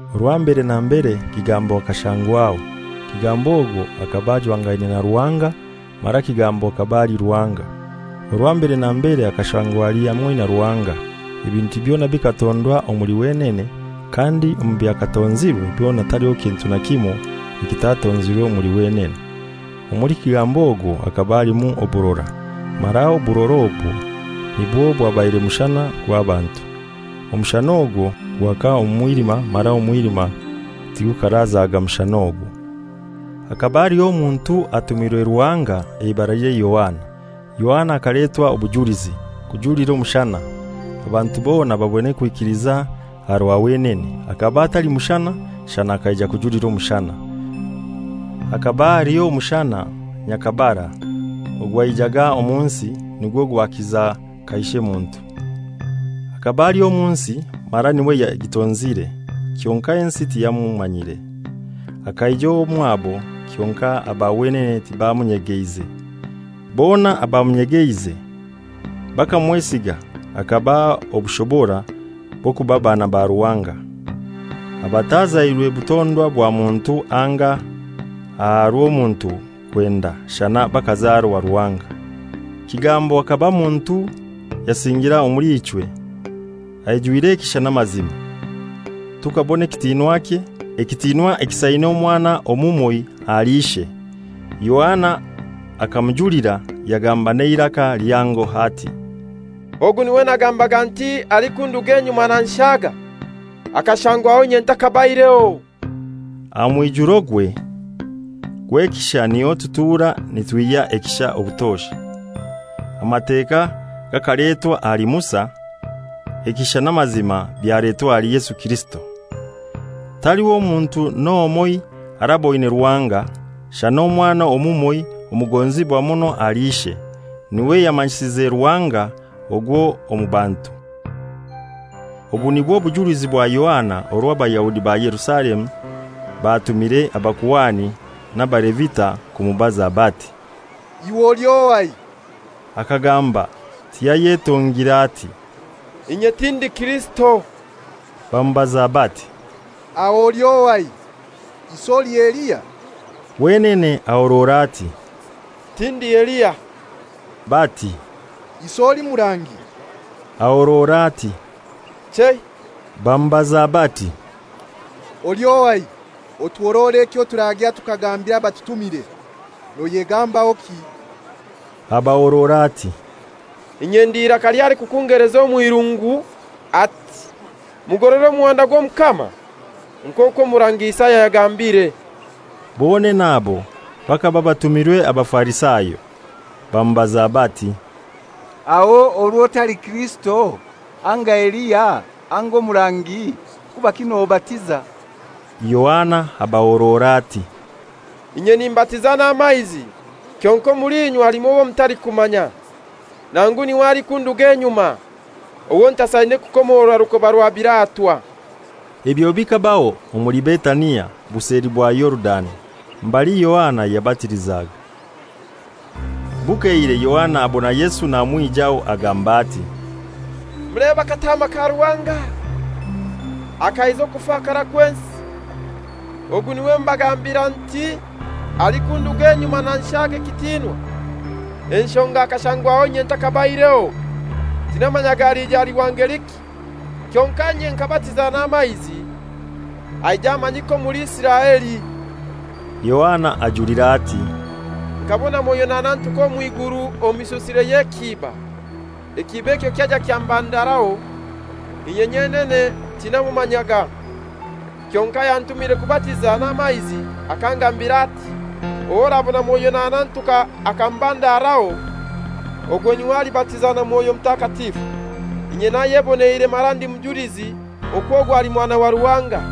Orwa mbere na mbere Kigambo akashangwaho. Kigambo ogwo hakaba ajwangaine na Ruhanga, mara Kigambo hakaba ali Ruhanga. Orwa mbere na mbere akashangwa ali hamoi na Ruhanga. Ebintu byona bikatondwa omuli wenene; kandi omu byakatonzirwe byona taliho kintu na kimoi ekitatonzirwe omuli wenene. Omuli Kigambo ogwo hakaba alimu oburora, mara oburora obwo nibwo bwabaire mushana gw'abantu. Omushana ogwo gwaka omu mwilima, mara omwilima tigukarazaga mushana ogwo. Hakaba haliho omuntu atumirwe Ruhanga, eibaralye Yohana. Yohana akaletwa obujulizi, kujulira omushana, abantu bona babone kwikiliza aha rwa wenene. Hakaba atali mushana, shana akaija kujulira omushana. Hakaba aliho omushana nyhakabara ogwaijaga omu nsi, nigwo gwakiza kaishe muntu. Hakaba ali omu nsi, mara n'iwe yagitonzire, kyonkai ensi tiyamumanyire. Akaija omwabo, kyonkai aba wenene tibamunyegeize. Kyonkai bona abamunyegeize, bakamwesiga, hakabaha obushobora bw'okuba baana ba Ruhanga; abatazairwe butondwa bwa muntu anga aha rw'omuntu kwenda, shana bakazarwa Ruhanga. Kigambo hakaba muntu yasingira omuli ichwe, aijwire ekisha n'amazima. Tukabona ekitinwakye, ekitinwa ekisaine Omwana omumoi ahali Ishe. Yohana akamujulira, yagamba n'eiraka lihango ati, «Ogu n'iwe nagambaga nti, ‹Alikunduga enyuma nanshaga. Akashangwaho inye nthakabaireho.›» Aha mwijurogwe gw'ekisha niho tutura nitwihya ekisha obutosha. Amateka gakaletwa ahali Musa; ekisha n'amazima byaletwa ahali Yesu Kirisito. Taliho muntu n'omoi araboine Ruhanga; shana Omwana omumoi omugonzibwa muno ahali Ishe, n'iwe yamanyisize Ruhanga ogwo omu bantu. Obu nibwo bujulizi bwa Yohana orwo Abayahudi ba Yerusalemu batumire abakuhani n'Abalevita kumubaza bati, «Iwe oli ohai?» Akagamba tiyayetongire, ati, «Inye tindi Kirisito.» Bamubaza bati, «Aho oli ohai? Isi oli Eliya?» Wenene ahorora ati, «Tindi Eliya.» Bati, «Isi oli murangi?» Ahorora ati, «Chei.» Bamubaza bati, «Oli ohai? Otuhorore ekyo turagya tukagambira abatutumire. Noyegambahoki?» Abahorora ati, «Inye ndi iraka ly'alikukungeleza omw'irungu, ati, ‹Mugorore omuhanda gw'Omukama,› nk'okwo omurangi Isaya yagambire.» Bonene abo bakaba batumirwe Abafarisayo. Bamubaza bati, «Aho orwo otali Kirisito, anga Eliya, anga omurangi, kubaki nobatiza?» Yohana abahorora ati, «Inye nimbatiza n'amaizi; kyonkai omuli inywe halimu owo mutalikumanya, nangu n'iwe alikunduga enyuma, owo ntasaine kukomorora rukoba rwa biratwa.» Ebyo bikabaho omuli Betania, buseli bwa Yorudani, mbali Yohana yabatilizaga. Bukeire Yohana abona Yesu namwijaho, agamba ati, «Mulebe Akataama ka Ruhanga, akaiza okufakara kw'ensi! Ogu n'iwe mbagambira nti, ‹Alikunduga enyuma nanshaga ekitinwa, enshonga akashangwaho inye nthakabaireho.› Tinamanyaga alija ali wa ngeliki, kyonkai inye nkabatiza n'amaizi, aije amanyike omuli Isiraeli.» Yohana ajulira ati, «Nkabona Mwoyo nahanantuka omw'iguru omu mishusire y'ekiiba, ekiiba ekyo kyaija kyamubandaraho. Inye nyenene tinamumanyaga; kyonkai ayantumire kubatiza n'amaizi akangambira ati, ‹Ow'orabona Mwoyo nahanantuka akamubandaraho, ogwo n'iwe alibatiza na Mwoyo Mutakatifu.› Inye nayeboneire mara ndi mujulizi okwo ogu ali Mwana wa Ruhanga.»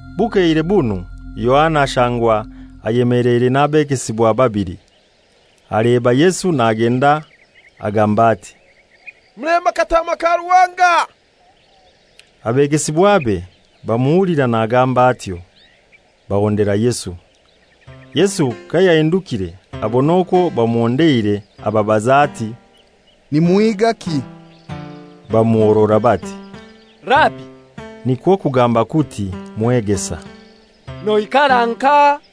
Bukeire bunu Yohana ashangwa ayemeleire n'abegesibwa babili. Aleba Yesu nagenda agamba ati, «Mulebe Akataama ka Ruhanga!» Abegesibwabe bamuhulira nagamba atyo, bahondera Yesu. Yesu kayahindukire abona okwo bamuhondeire, ababaza ati, «Nimuhigaki?» Bamuhorora bati, «Rabi,» nikwo kugamba kuti, «Mwegesa, noikara nkahai?»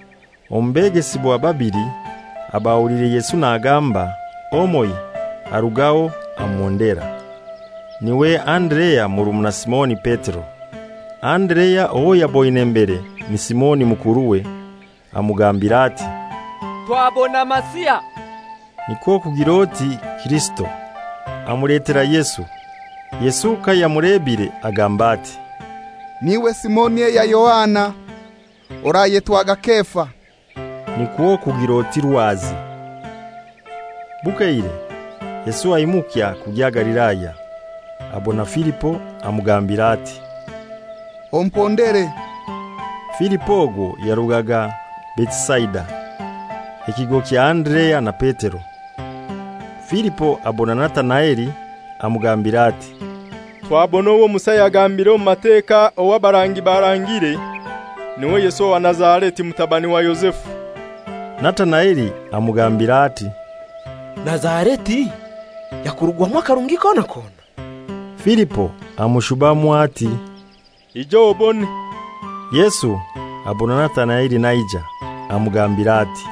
Omu begesibwa babili abahuliire Yesu nagamba, omoi arugaho amuhondera: N'iwe Anderea murumuna Simoni Petero. Anderea owo yaboine mbere ni Simoni mukuruwe, amugambira ati, «Twabona Masiha,» nikwo kugir'oti Kirisito. Amuletera Yesu. Yesu kayamulebire agamba ati, «N'iwe Simoni eya Yohana? Orayetwaga Kefa,» nikwo kugir'oti Rwazi. Bukeire, Yesu aimukya kugya Galilaya. Abona Filipo, amugambira ati, «Ompondere.» Filipo ogwo yarugaga Betisaida, ekigo kya Anderea na Petero. Filipo abona Natanaeli, amugambira ati, «Twabona owo Musa yagambire omu Mateka owo abarangi barangire, n'iwe Yesu owa Nazareti, mutabani wa Yozefu.» Natanaeli amugambira ati, «Nazareti yakurugwamu akarungi kona kona?» Filipo amushubamu ati, «Ija obone.» Yesu abona Natanaeli naija, amugambira ati,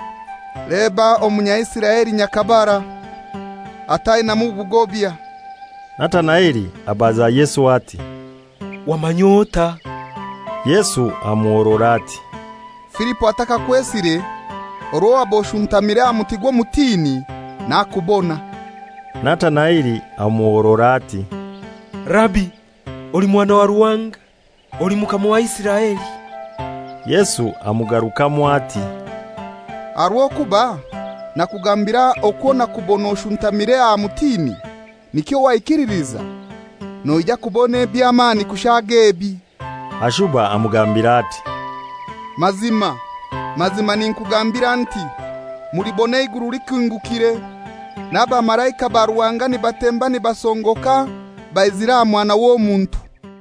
«Leba Omunyaisiraeli nyhakabara, atainamu bugobya!» Natanaeli abaza Yesu ati, «Wamany'otai?» Yesu amuhorora ati, «Filipo atakakwesire, orwo waba oshuntamire aha muti gw'omutini, nakubona.» Natanaeli amuhorora ati, «Rabi, oli Mwana wa Ruhanga! Oli Mukama wa Isiraeli?» Yesu amugarukamu ati, «Aha rw'okuba nakugambira okwo nakubona oshutamiire aha mutini, nikyo waikililiza? Noija kubona eby'amani kushaaga ebi.» Ashuba amugambira ati, «Mazima, mazima ninkugambira nti, mulibona eiguru likingukire, n'abamalaika ba Ruhanga nibatemba nibasongoka baizire aha Mwana w'Omuntu.»